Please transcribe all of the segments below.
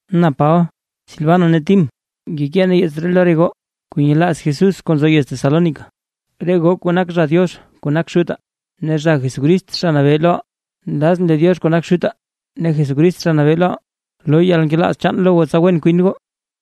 Na Paba, Silvano ne Tim, ngekee nee yeets ree lo re goo kuu nyelaaz Jesús kuu nzo yez Tesalónica, re goo kuu nak zha Diox kuu nak Xutaa, ne zha Jesucrist Zha Nabee loʼaa. Nlazʼn lee Diox kuu nak Xutaa ne Jesucrist Zha Nabee loʼaa, loo yalnkelaaz chaan lo goo tsa wen kwin goo.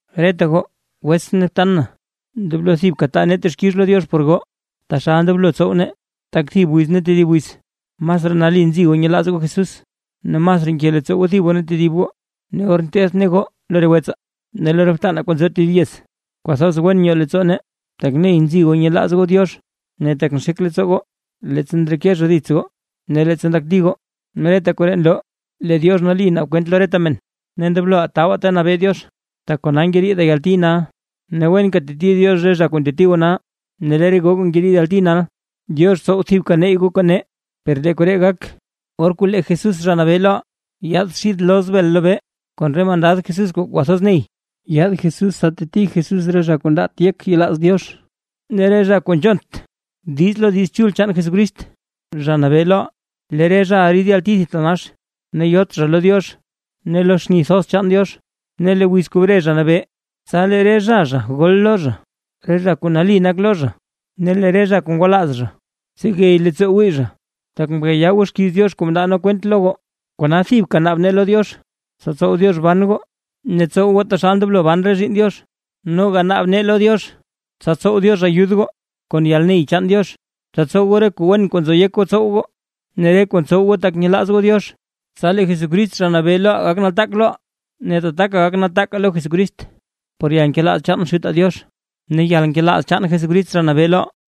Reta goo wetsʼn ne btan na, ndoblo thibka taa nee texkix lo Diox por goo taxal ndoblo tsow nee, tak thib wiz ne tedib wiz masraa nali nzi goo nyelaaz goo Jesús ne masraa nke leettsoo goo thib goo ne tedib goo. Ne or nteth nee goo lo re wetsaa ne lo re btanaa kuu nzo tedib yez, kwathoz wen nyoo leettsoo nee, tak ney nzi goo nyelaaz goo Diox ne tak nxek leettsoo goo, leettsa ndreke zha dits goo ne leettsa ndakti goo. Ne reta koree nloo lee Diox nali naab Diox kwent lo reta men, ne ndobloʼaa tabaa ta nabee Diox tak kona ngeriidaa yalti nal. Ne wenka teti Diox re zha kuu nteti goo nal, ne lee re goo kuu ngeriid yalti nal, Diox tsow thibka neyy goo kon nee, per lee koree gak, or kuu lee Jesús Zha Nabee loʼaa yaad xid loz bel lobee kon re mandad Jesús kuu kwathoz ney. Yaad Jesús tsa teti Jesús re zha kuu ndaat yek yelaaz Diox, ne re zha kuu nzhont diiz lo Diiz Chul chaan Jesucrist, Zha Nabee loʼaa. Lee re zhaʼa rid yalti thitanax, ne yot zha lo Diox ne lo xni thoz chaan Diox. Ne lee wiz kuu bre Zha Nabee, tsa lee re zha zha gol lo zha, re zha kuu nali nak lo zha ne lee re zha kuu ngwalaaz zha tsegey leettsoo wii zha. Tak mkayaa goo xkiiz Diox kuu mndaa nee kwent lo goo. Kona thibka naab nee lo Diox tsa tsow Diox ban goo ne tsow goo taxal ndoblo ban re zhiinn Diox. Noga naab nee lo Diox tsa tsow Diox ayud goo kon yalney chaan Diox, tsa tsow goo re kuu wen kuu nzo yek goo tsow goo ne re kuu ntsow goo tak nyelaaz goo Diox. Tsa lee le Jesucrist Zha Nabee loʼaa gak nataak loʼaa, ne tataka gak nataakaa lo Jesucrist, por yalnkelaaz chaan Xutaa Diox ne yalnkelaaz chaan Jesucrist Zha Nabee loʼaa.